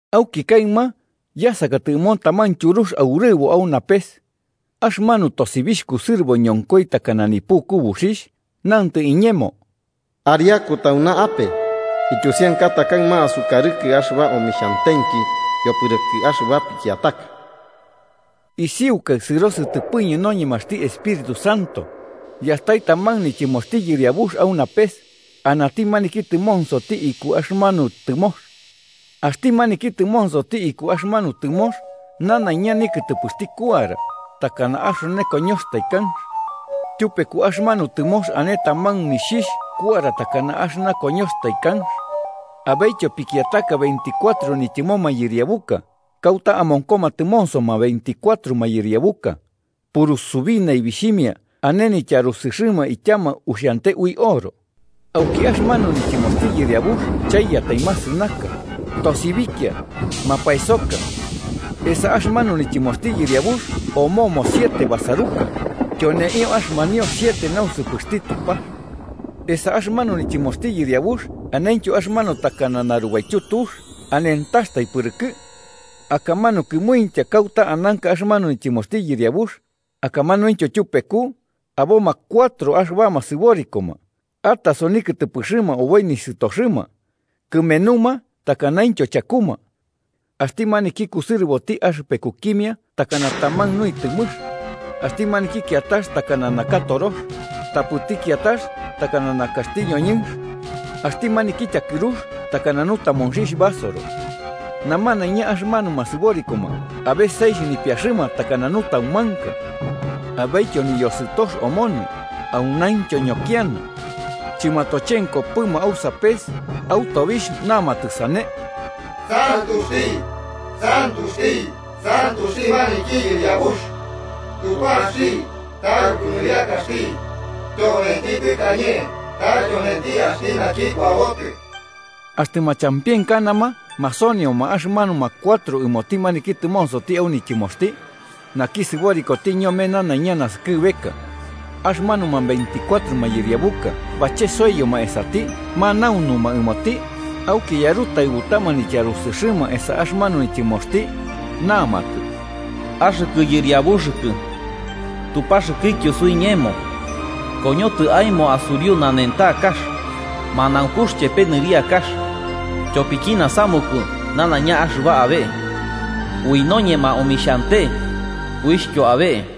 Auki kaɨma, yasakatɨ ɨmo taman tyurux aurɨbo au napes. Axɨmanu tosibixh kusɨrɨbo ñonkoi, takana nipuku buxixh, nantɨ iñemo: “Ariaku tauna ape ityusiankata kaɨma asukarɨkɨ axɨba omixhantenki yopɨrɨkɨ axɨba pikiataka.” Isiukai sɨro sɨtɨpɨñɨ noñemaxti Espíritu Santo, yastai taman nityɨmoxti Yɨriabux au napes, anati maniki tɨmonsoti iku axɨmanu tɨmox. Axti maniki tɨmonsoti iku axɨmanu tɨmox nanaiña nikɨtɨpɨxti kuara, takana axone koñoxtai kanx. Tyupeku axɨmanu tɨmox ane taman nixhixh kuara takana axɨna koñoxtai kanx. Abetyo pikiataka veinticuatro nityɨmo mayɨriabuka, kauta amonkoma tɨmonsoma veinticuatro mayɨriabuka: purusubi naibixhimia ane nityarusɨxɨma ityama uxiante ui oro. Auki axɨmanu nityɨmoxti Yɨriabux chaiyatai masɨnaka, tosibikia mapaesoka. Esa axɨmanu nityɨmoxti Yɨriabux omomo siete basaruka, tyoneio axɨmanio siete nausɨpɨxti Tupax esa axɨmanu nityɨmoxti Yɨriabux anentyo axɨmanu takana narubaityu tux, anentaxtai pɨrɨkɨ. Akamanu kɨmuintya kauta ananka axɨmanu nityɨmoxti Yɨriabux, akamanuintyo tyupeku, aboma cuatro axɨbama sɨborikoma, ataso nikɨtɨpɨxɨma oboi nisɨtoxɨma, kɨmenuma takanaintyo chakuma. Axti maniki kusɨrɨboti axɨpekukimia takana taman nuitɨmɨx, axti maniki kiatax takana naka torox, tapɨti kiatax takana nakaxti ñoñɨnx, axti maniki tyakɨrux takana nutamonxixh basoro. Namanaiña axɨmanuma sɨborikoma abe seixh nipiaxɨma takana nutaumanka. Abetyo niyosɨtox omonɨ, aunaintyo ñokiana. Chɨmatochenkopɨma au sapes au tobixh namatɨ sane: “¡Santuxti, santuxti, santuxti maniki Yɨriabux, Tupaxti taruku nɨriakaxti, tyonenti tɨkañe ta tyonenti axti naki kuabotɨ!” Axtɨ machampienkanama masonioma axɨmanuma cuatro ɨmoti maniki tɨmonsoti au nityɨmoxti, naki sɨborikoti ñome nanaiña naskɨbeka. Axɨmanuma veinticuatro mayɨriabuka bachesoiyoma esati manaunuma ɨmoti, auki yarɨtaɨbutama nityarusɨxɨma esa axɨmanu nityɨmoxti, namatɨ: “Axɨkɨ Yɨriabuxɨkɨ Tupaxɨkɨtyo suiñemo, koñotɨ aemo asuriu nanentakax, manaunkux chepe nɨriakax, tyopiki nasamuku nanaiña axɨba abe. Ui noñema omixhante uixhtyo abe.”